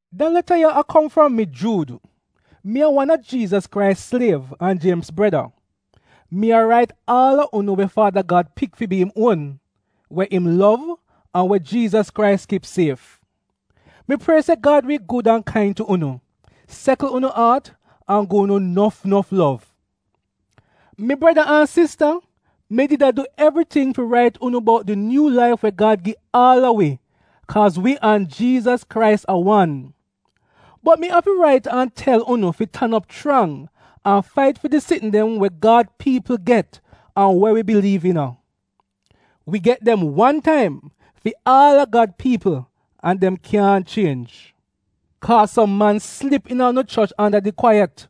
Da leta ya a kom fram mi, Juud. Mi a wan a Jiizas Krais sliev an Jiemz breda. Mi a rait aal a unu we Faada Gad pik fi bi fi im uon, we im lov, an we Jiizas Krais kip sief. Mi prie se Gad wi gud an kain tu unu, sekl unu aat, an gi unu nof nof lov. Mi breda an sista, mi did a du evriting fi rait unu bout di nyuu laif we Gad gi aal a wi kaaz wi an Jiizas Krais a wan. Bot mi afi rait an tel unu fi tan op chrang an fait fi di sitn dem we Gad piipl get, an we wi biliiv iina. Wi get dem wan taim fi aal a Gad piipl an dem kyaahn chienj. Kaaz som man slip iina unu choch anda di kwaiyat.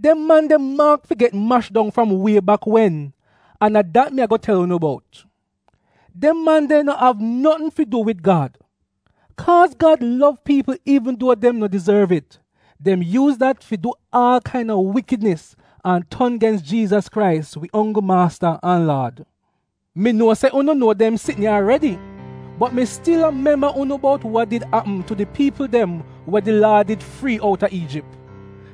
Dem man de maak fi get mash dong fram wie bak wen, an a dat mi a-go tel unu bout. Dem man de no av notn fi du wid Gad. Kaaz Gad lov piipl iivn duo dem no dizorv it, dem yuuz dat fi du aal kain-a wikidnis an ton gens Jiizas Krais, wi onggl maasta an Laad. Mi nuo se unu nuo dem sitn ya aredi, bot mi stil a memba unu bout wa did apm tu di piipl dem wa di Laad did frii outa Iijip.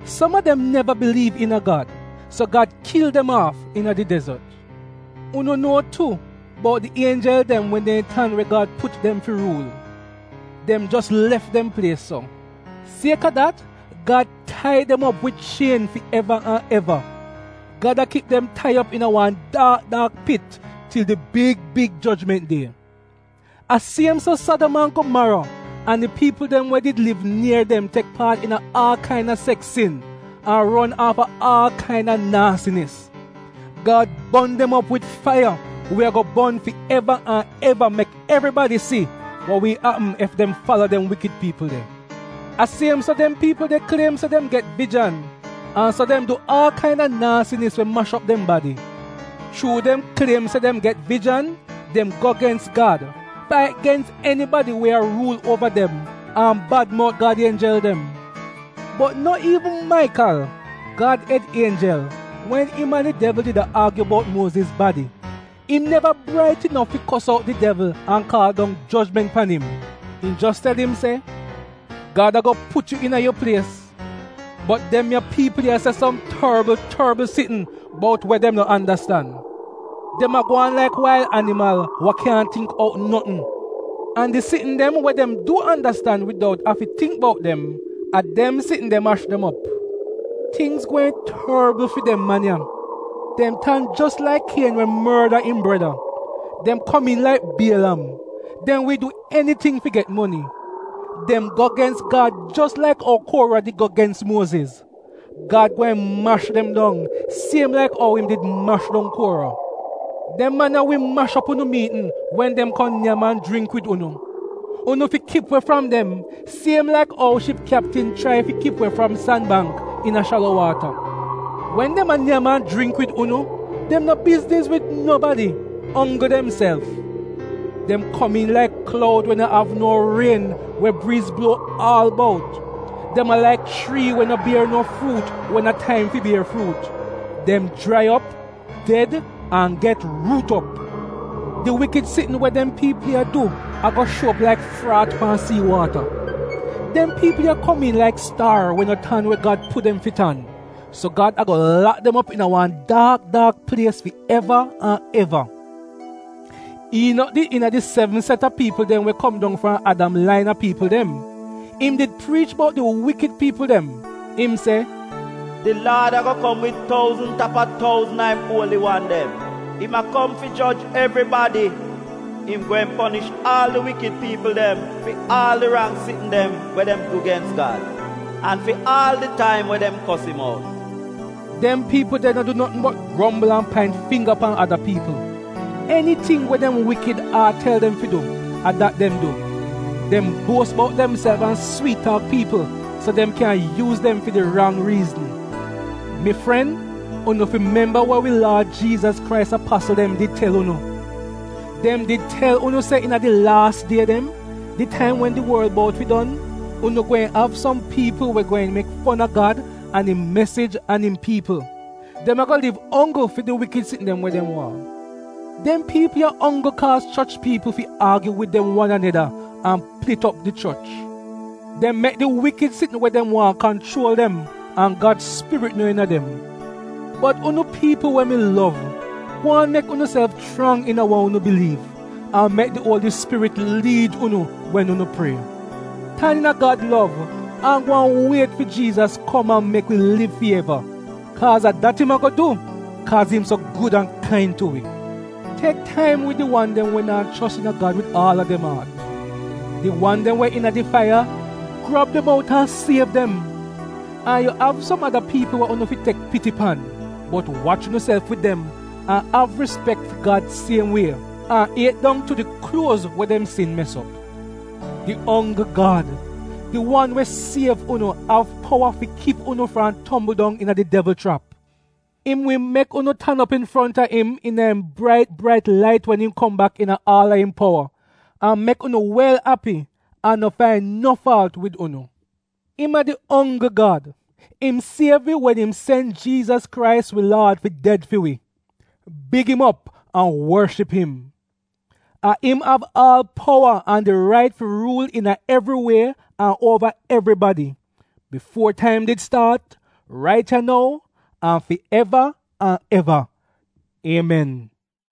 Som a dem neva biliiv iina Gad, so Gad kil dem aaf iina di dezot. Unu nuo tu bout di ienjel dem wa neehn tan we Gad put dem fi ruul. Dem jos lef dem plies so. Siek-a dat Gad tai dem op wid chien fi eva an eva. Gad a kip dem tai op iina wan daak daak pit til di big big jojment die. A siem so Sadam an Gomaro an di piipl dem we liv nier dem tek paat iina aal kain-a seks sin an ron aafa aal kain-a naasinis. Gad bon dem op wid faiya we a-go bon fi eva an eva mek evribadi si wa wi apm ef dem fala dem wikid piipl de. A siem so dem piipl de kliem se dem get vijan an so dem du aal kain-a naasinis we mash op dem badi. Chuu dem kliem se dem get vijan dem go gens Gad, fait gens enibadi we a ruul uova dem, an bad mout Gad ienjel dem. Bot no iivn Maikal, Gad ed ienjel, wen im an di devl did a aagyu bout Muoziz badi, im neva brait inof fi kos out di devl an kaal dong jojment pan im. Im jos tel im se, “Gad a-go put yu iina yu plies.” Bot dem ya piipl ya se som torbl torbl sitn bout we dem no andastan. Dem a gwaan laik wail animal wa kyaahn tingk out notn. An di sitn dem we dem du andastan widout afi tingk bout dem, a dem sitn de mash dem op. Tingz gweehn torbl fi dem man ya! Dem tan jos laik Kien we morda im breda. Dem komiin laik Bielam — dem wi du eniting fi get moni. Dem go gens Gad jos laik ou Kuora did go gens Muoziz. Gad gweehn mash dem dong siem laik ou im did mash dong Kuora. Dem man ya wi mash op unu miitn wen dem kom nyam an jringk wid unu. Unu fi kip we fram dem, siem laik ou ship kyaptin chrai fi kip we fram san bangk iina shalo waata. Wen dem a nyam an jringk wid unu dem no bizniz wid nobadi onggl demself. Dem komiin laik kloud we no av no rien we briiz bluo aal bout. Dem a laik chrii we no bier no fruut wen a taim fi bier fruut. Dem jrai op, ded an get ruut op. Di wikid sitn we dem du a-go shuo op laik fraat pan sii waata. Dem piipl ya komiin laik staar we no tan we Gad put dem fi tan, so Gad a-go lak dem op iina wan daak daak plies fi eva an eva. Iinok did iina di sevn set a pikni we kom dong fram Adam lain a piipl dem. Im did priich bout di wikid piipl dem. Im se, “Di Laad a-go kom wid touzn tap a touzn a im uoli wan dem. Im a kom fi joj evribadi. Im gweehn ponish aal di wikid piipl dem fi aal di rang sitn dem we dem du gens Gad an fi aal di taim we dem kos im out.” Dem piipl de no du notn bot grombl an paint fingga pan ada piipl; eniting we dem wikid aat tel dem fi du — a dat dem du. Dem buos bout demself an swiit-taak piipl so dem kyan yuuz dem fi di rang riizn. Mi fren, unu fi memba wa wi Laad Jiizas Krais apasl dem did tel unu. Dem did tel unu se iina di laas die dem, di taim wen di worl bout fi don, unu gweehn av som piipl we gweehn mek fon a Gad an im mesij an im piipl. Dem a-go liv onggl fi di wikid sitn dem we dem waahn. Dem piipl ya onggl kaaz choch piipl fi aagyu wid wan aneda an plit op di choch. Dem mek di wikid sitn we dem waahn kanchuol dem, an Gad Spirit no iina dem. Bot unu piipl we mi lov, gwaan mek unuself chrang iina wa unu biliiv, an mek di Uoli Spirit liid unu wen unu prie. Tan iina Gad lov an gwaan wiet fi Jiizas kom an mek wi liv fi eva, kaaz a dat im a-go du, kaaz im so gud an kain tu wi. Tek taim wid di wan dem we naa chos iina Gad wid aal a dem aat. Di wan dem we iina di faiya, grab dem out an siev dem; an yu av som ada piipl we unu fi tek piti pan, bot wach unuself wid dem, an av rispek fi Gad siem wie, an iet dong tu di kluoz we dem sin mes op. Di onggl Gad, di wan we siev unu, av powa fi kip unu fram tombl dong iina di devl chrap. Im wi mek unu tan op infronta im iina im brait brait lait wen im kom bak iina aal a im powa, an mek unu wel api an no fain no faalt wid unu. Im a di onggl Gad. Im siev wi wen im sen Jiizas Krais wi Laad fi ded fi wi. Big im op an worship im. A im av aal powa an di rait fi ruul iina evri wie an uova evribadi, bifuo taim did staat, rait ya nou, an fi eva an eva. Iemen!